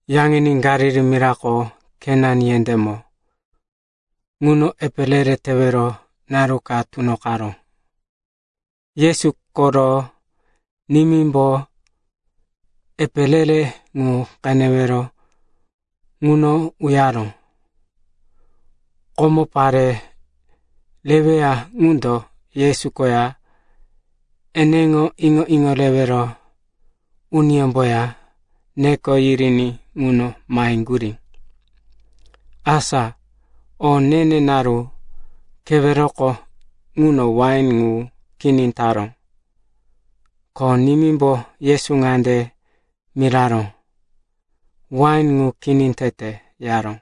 Yaŋini Galili mirako Kana yendémo ŋuno epe re-re tewero naru ka tunoqaró. Yesu koro nimímbo epe re-re ŋu qenewero ŋuno uyaró. Komo, pare reweya ŋundo Yesu koya eneŋo iŋo-iŋo rewero uniyómboya neko yiriní ŋuno maheŋgurí. Asa o ne-ne naru keweroko ŋuno wain ŋu kini taró, ko nimímbo Yesu ŋande miraró, “Wain ŋu kini tete,” yaró.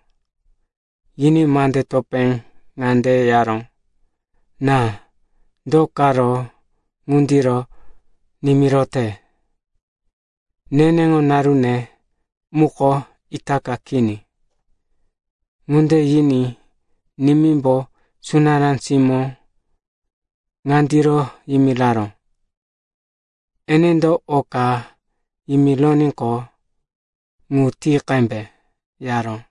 Yiní mande topé ŋande yaró, “Ná, do karo ŋundiro nimirote? Neneŋo narune muko itaka kini.” Ŋunde yiní nimímbo sunará simó ŋandiro yimiraró, “Enendo o ka yimironíqo, ŋu ti qembe,” yaró.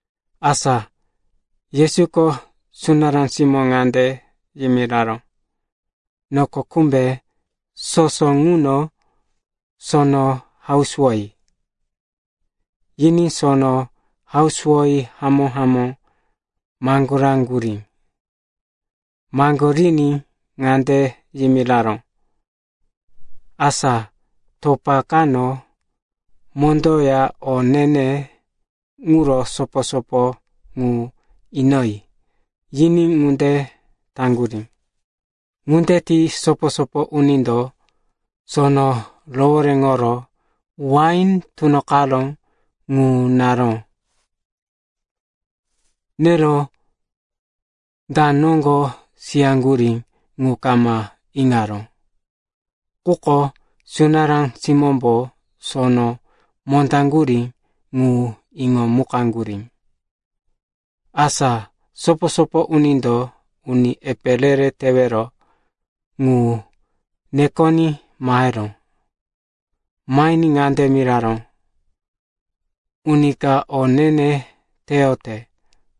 Asa Yesuko sunará simó ŋande yimiraró, “Noko kumbe soso ŋuno sono hausuwoyi,” yiní sono hausuwoyi hamó-hamó maŋgoraŋgurí. Maŋgoriní ŋande yimiraró, “Asa topa kano mondoya o ne-ne ŋuro sopo-sopo ŋu inoyi,” yiní ŋunde taŋgurí. Ŋunde ti sopo-sopo unindo sono rohoréŋoro wain tunoqaró ŋu naró. Nero da noŋgo siyaŋgurí ŋu kama iŋaró, quko sunará simómbo sono mondaŋgurí ŋu iŋomukaŋgurí. Asa sopo-sopo unindo uni epe re-re tewero ŋu nekoní maheró. Mahiní ŋande miraró, “Uni ka o ne-ne teyote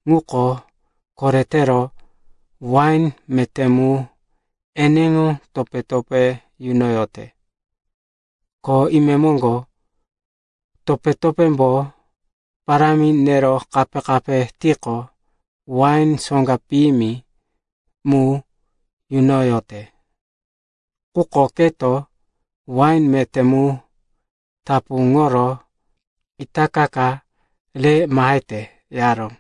ŋuko koretero wain meté mu eneŋo topé-topé yunoyote. Ko imemoŋgo, topé-topémbo parámi nero kape-kape tiqo, wain soŋga piyimi mu yunoyote. Quko keto wain meté mu tapuŋoro itaka ka re mahete,” yaró.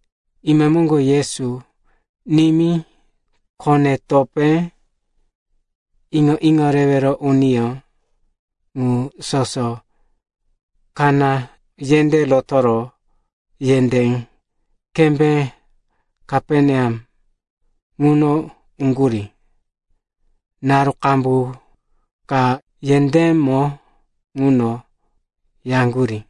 Imemoŋgo Yesu, nimí, kone-topé, iŋo-iŋo rewero uniyó, ŋu soso Kana yendé rotoro yendé kembé Kaperneam ŋuno uŋgurí. Naru qambu ka yendémo ŋuno yaŋgurí.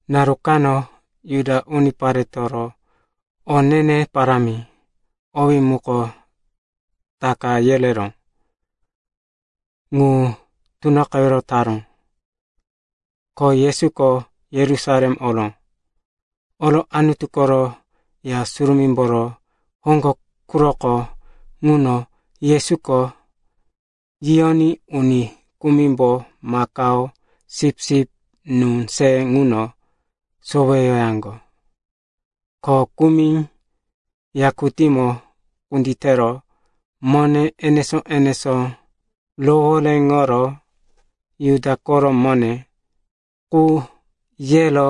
Naru kano Juda uniparetoro o ne-ne parámi, owí muko Taka yereró, ŋu tunoqewero taró, ko Yesuko Yerusalem oró. Oro Anutu koro Ya Surumímboro hoŋgo quroko ŋuno Yesuko yiyoní uni kumimbo makao, sipsip, nú se ŋuno soweyoyaŋgo. Ko kumi yakutímo kunditero mone enesó-enesó rohoréŋoro Juda koro mone qu yero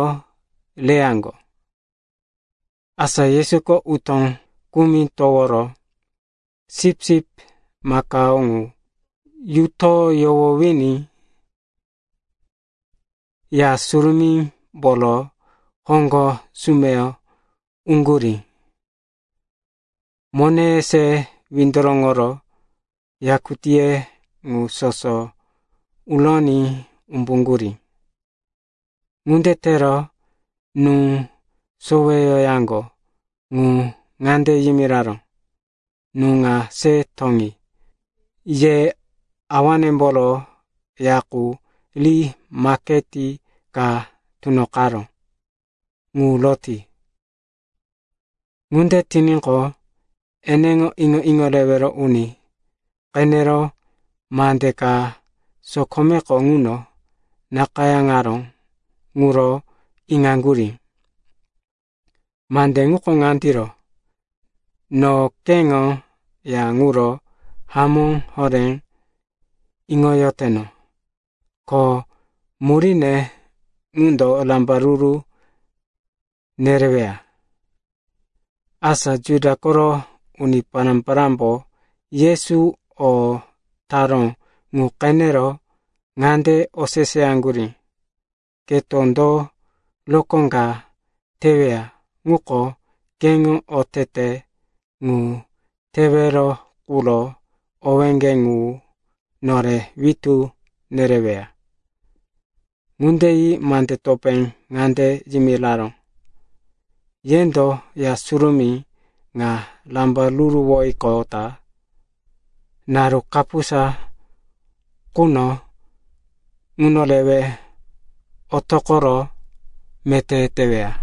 reyaŋgo. Asa Yesuko utó kumi toworo sipsip, makao ŋu yuto yohowiní Ya Surumímboro hoŋgo sumeyo uŋgurí. Moneye se windoroŋoro yakutíye ŋu soso uroní umbuŋgurí. Ŋunde tero nú soweyoyaŋgo ŋu ŋande yimiraró, “Nú ŋa se toŋi! Ye Awanemboro Ya qu ri maketi ka tunoqaró! Ŋu roti!” Ŋunde tiníqo, eneŋo iŋo-iŋo rewero uni qenero mande ka sokomeko ŋuno nakayáŋaró ŋuro iŋaŋgurí. Mande ŋuko ŋandiro, “No keŋo ya ŋuro hamó horé iŋoyoteno. Ko muríne ŋundo rambaruru nereweya.” Asa Juda koro uni pará-parámbo Yesuko o taró ŋu qenero ŋande oseseyaŋgurí, “Keto do rokó ka teweya ŋuko keŋo otete ŋu tewero quro owéŋge ŋu nore witú nereweya?” Ŋunde yi mande topé ŋande yimiraró, “Yendo Ya Surumí ŋa rambaruruwoyiqota naru kapusa quno ŋuno rewe otoqoro meté teweya.”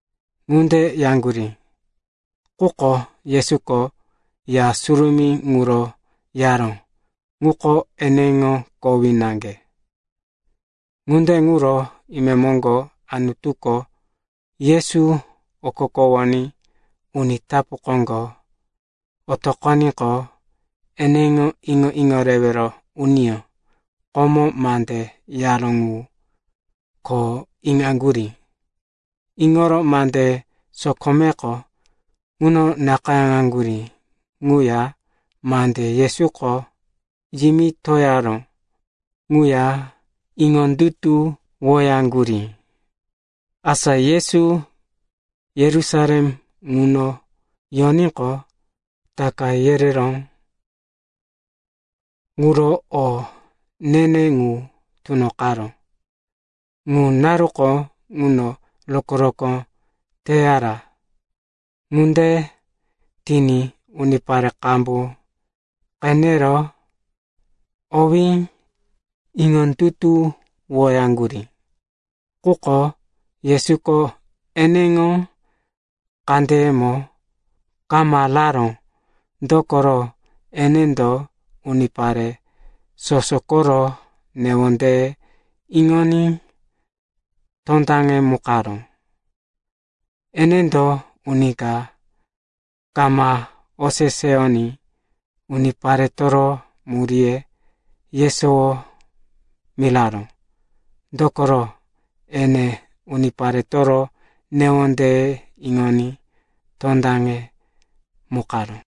Ŋunde yaŋgurí, quko Yesuko ya surumí ŋuro yaró ŋuko eneŋo kowí naŋge. Ŋunde ŋuro imemoŋgo, Anutuko Yesu okokowoní uni tapu koŋgo otoqoníqo, eneŋo iŋo-iŋo rewero uniyó komo mande yaró ŋu ko iŋaŋgurí. Iŋoro mande sokomeko ŋuno nakayáŋgurí ŋuya mande Yesuko yimitoyaró ŋuya iŋondutuwoyaŋgurí. Asa Yesu Yerusalem ŋuno yoníqo, Taka yereró quro o ne-ne ŋu tunoqaró. Ŋu naruko ŋuno rokó-rokó teyara. Ŋunde tiní unipare qambu qenero owí iŋondutuwoyaŋgurí. Quko Yesuko eneŋo kandeyemo kama raró. Dokoro enendo unipare soso koro newondeye iŋoní tondaŋemukaró. Enendo uni ka kama oseseyoní uniparetoro muríye yesowo miraró. Dokoro ene uniparetoro newondeye iŋoní tondaŋemukaró.